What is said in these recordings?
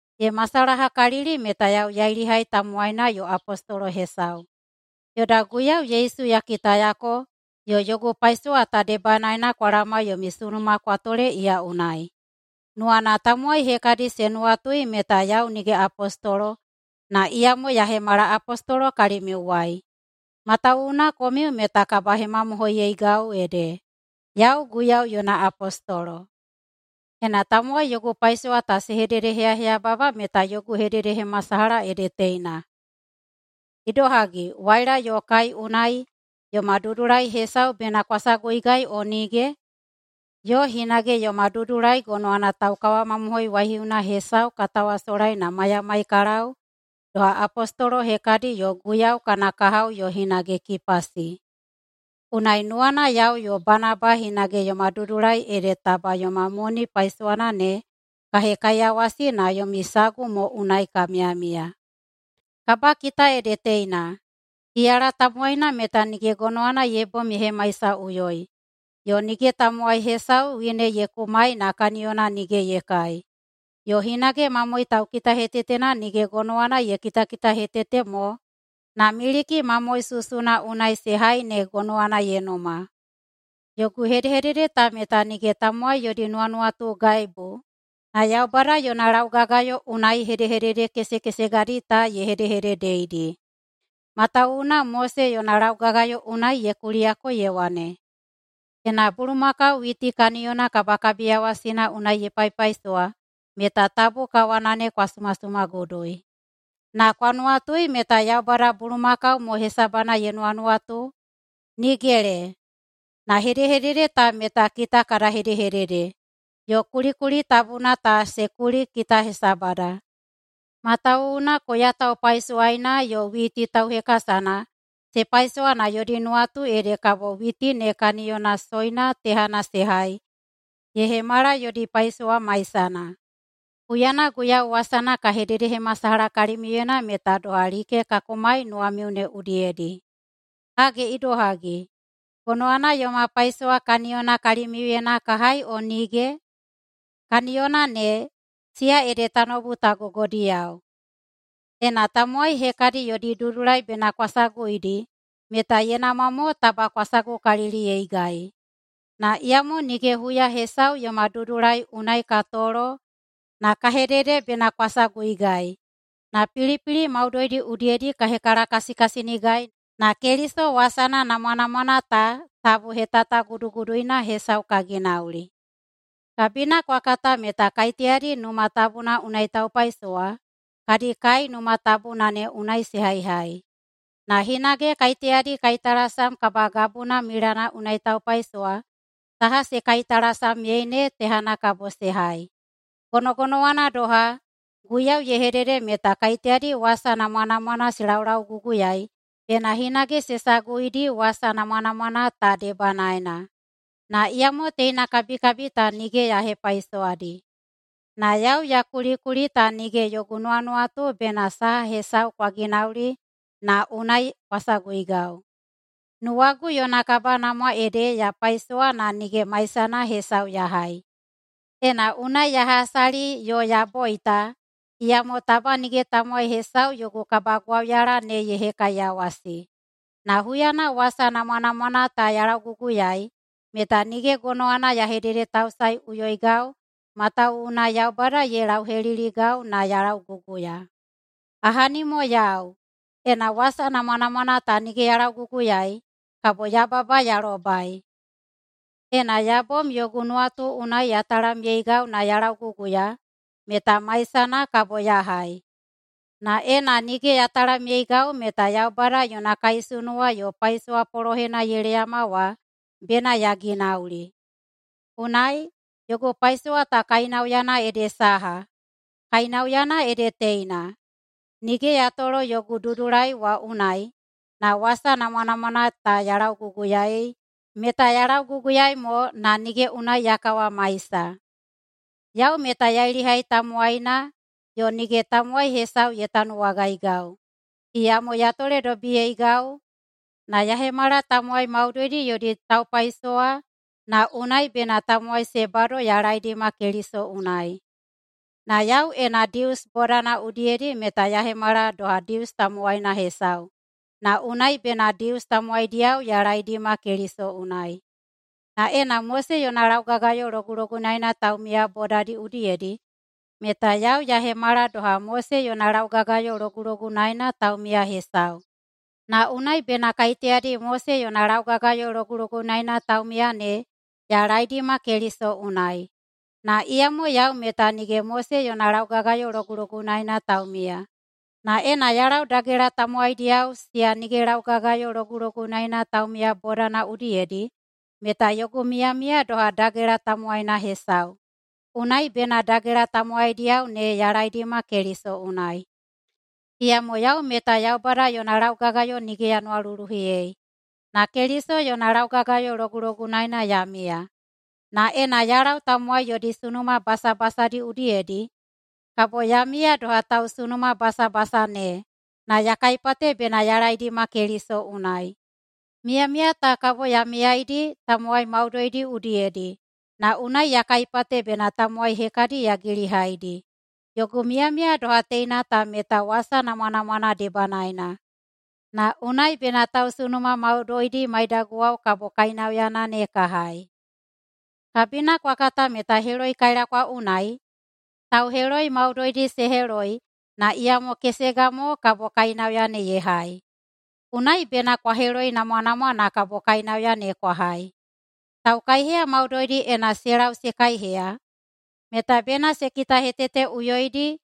Ye masalahakalili meta yau yailihai tamowaina yo apostolo hesau. Yoda Guiyau Yesu ya kitayako, yo yogu paisowa ta debanaena kwa laoma yomi sunuma kwa tole iya unai. Nuwana tamowai hekadi se nuwatui meta yau nige apostolo, na iyamo ya hemala apostolo kalimiuwai. Matawuwuna komiu meta kabahemamohoiyeigau ede yau Guiyau yona apostolo. Ena tamowai yogu paisowa ta se hededeheyaheyababa meta yogu hededehemasalaha ede teina: Idohagi, waila yo kai unai yoma dudulai hesau bena kwa saguigau o nige? Yo hinage yoma dudulai gonowana taukawamamohoi waihiuna hesau ka tawasolai na maiyamai ka lau doha apostolo hekadi yo Guiyau kana kahao yo hinage Kipasi. Unai nuwana yau yo Banaba hinage yoma dudulai ede taba yoma moni paisowana ne ka hekaiyawasi na yomi sagu mo unai ka miyamiya! [Kabakita ede teina:] Iyala tamowaina meta nige gonowana ye bom ye hemaisaꞌuyoi. Yo nige tamowai hesau wine ye kumai na kaniyona nige ye kai. Yo hinage mamoe taukitahetetena nige gonowana ye kitakitahetete mo na miliki mamoe susuna unai se hai ne gonowana ye numa. Yogu hedehedede ta meta nige tamowai yodi nuwanuwatugaibu, na Yaubada yona laugagayo unai hedehedede kesekesegadi ta ye hedehededeidi. Matawuwuna Mose yona laugagayo unai ye kuliyako ye wane, “Ena bulumakau witi kaniyona kabakabiyawasina unai ye paipaisowa meta tabu kawana ne kwa sumasumagudui.” Na kwa nuwatui meta Yaubada bulumakau mo hesabana ye nuwanuwatu? Nigele! Na hedehedede ta meta kita kada hedehedede, yo kulikuli tabuna ta se kuli kita hesabada, matawuwuna koya taupaisowaina yo witi tauhekasana se paisowa na yodi nuwatu ede kabo witi ne kaniyona soina tehana se hai ye hemala yodi paisowa maisana. Huyana Guiyau wasana ka hededehemasalaha kalimiuyena meta doha like ka kumai nuwamiu ne udiyedi. Hage idohagi, gonowana yoma paisowa kaniyona kalimiuyena ka hai o nige? Kaniyona ne, siya ede tanoubu ta gogodiyao. Ena tamowai hekadi yodi dudulai bena kwa saguidi meta ye namwa mo taba kwa sagukaliliyeigai. Na iyamo nige huya hesau yoma dudulai unai ka tolo na ka hedede bena kwa saguigai, na pilipili maudoidi udiyedi ka hekalakasikasinigai na Keliso wasana namwanamwana ta tabu hetataguduguduina hesau ka ginauli. Kabina kwa kata meta kaiteyadi Numa Tabuna unai taupaisowa kadi kai Numa Tabuna ne unai se haihai. Na hinage kaiteyadi kaitalasam kabagabuna milana unai taupaisowa saha se kaitalasamyei ne tehana kabo se hai. Gonogonowana doha, Guiyau ye hedede meta kaiteyadi wasa namwanamwana se laulauguguyaei bena hinage se saguidi wasa namwanamwana ta debanaena. Na iyamo teina kabikabi ta nige ya hepaisowadi. Na yau ya kulikuli ta nige yogu nuwanuwatu bena saha hesau kwa ginauli na unai kwa saguigau. Nuwagu yona kabanamwa ede ya paisowa na nige maisana hesau ya hai. Ena unai ya hasali yo ya boita, iyamo taba nige tamowai hesau yogu kabagwauyala ne ye hekaiyawasi. Na huyana wasa namwanamwana ta ya lauguguyaei meta nige gonowana ya hededetausaeꞌuyoigau matawuwuna Yaubada ye lauheliligau na ya lauguguya. Ahani mo yau, ena wasa namwanamwana ta nige ya lauguguyaei kabo yababa ya lobai! Ena ya bom yogu nuwatu unai ya talamyeigau na ya lauguguya, meta maisana kabo ya hai. Na ena nige ya talamyeigau meta Yaubada yona kaisunuwa yo paisowa polohena ye leyama wa bena ya ginauli. Unai, yogu paisowa ta kainauyana ede saha? Kainauyana ede teina: Nige ya tolo yogu dudulai wa unai, na wasa namwanamwana ta ya lauguguyaei meta ya lauguguyaei mo na nige unai ya kawamaisa. Yau meta yailihai tamowaina yo nige tamowai hesau ye tanuwagaigau, iyamo ya toledobiyeigau na ya hemala tamowai maudoidi yodi taupaisowa na unai bena tamowai se bado ya laeidima Keliso unai. Na yau ena Dius bodana udiyedi meta ya hemala doha Dius tamowaina hesau, na unai bena Dius tamowaidiyao ya laeidima Keliso unai. Na ena Mose yona laugagayo logulogunaena taumiya bodadi udiyedi meta yau ya hemala doha Mose yona laugagayo logulogunaena taumiya hesau, na unai bena kaiteyadi Mose yona laugagayo logulogunaena taumiya ne ya laeidima Keliso unai. Na iyamo yau meta nige Mose yona laugagayo logulogunaena taumiya. Na ena ya lau dagela tamowaidiyao siya nige laugagayo logulogunaena taumiya bodana udiyedi, meta yogu miyamiya doha dagela tamowaina hesau, unai bena dagela tamowaidiyao ne ya laeidima Keliso unai. Iyamo yau meta Yaubada yona laugagayo nige ya nuwaluluhiyei, na Keliso yona laugagayo logulogunaena ya miya. Na ena ya lau tamowai yodi sunuma basabasadi udiyedi, kabo ya miya doha tausunumabasabasa ne, na ya kaipate bena ya laeidima Keliso unai. Miyamiya ta kabo ya miyaidi tamowai maudoidi udiyedi na unai ya kaipate bena tamowai hekadi ya gilihaidi. Yogu miyamiya doha teina ta meta wasa namwanamwana debanaena, na unai bena tausunuma maudoidi maidaguwao kabo kainauyana ne ka hai. Kabina kwa katakalili meta heloikailakwa unai tauheloi maudoidi se heloi na iyamo kesega mo kabo kainauya ne ye hai. Unai bena kwa heloinamwanamwa na kabo kainauya ne kwa hai. Taukaiheya maudoidi ena se lau se kaiheya meta bena se kitaheteteꞌuyoidi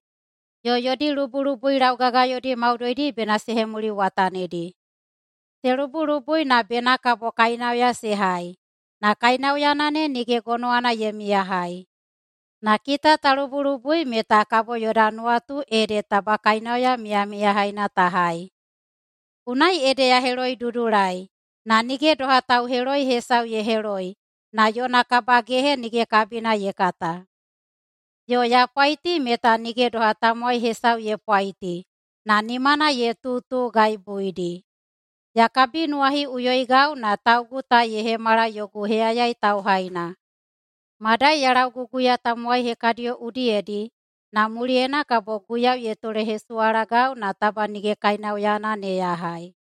yo yodi lubulubui laugagayodi maudoidi bena se hemuliwatanidi. Se lubulubui na bena kabo kainauya se hai, na kainauyana ne nige gonowana ye miyahai. Na kita ta lubulubui meta kabo yoda nuwatu ede taba kainauya miyamiyahaina ta hai. Unai ede ya heloidudulai na nige doha tauheloi hesau ye heloi na yona kabagehe nige kabina ye kata. Yo ya pwaiti meta nige doha tamowai hesau ye pwaiti na nimana ye tutugaibuidi. Ya kabinuwahiꞌuyoigau na taugu ta ye hemala yogu heyayai tauhaina, madai ya lauguguya tamowai hekadiyo udiyedi na muliyena kabo Guiyau ye tolehesuwalagau na taba nige kainauyana ne ya hai.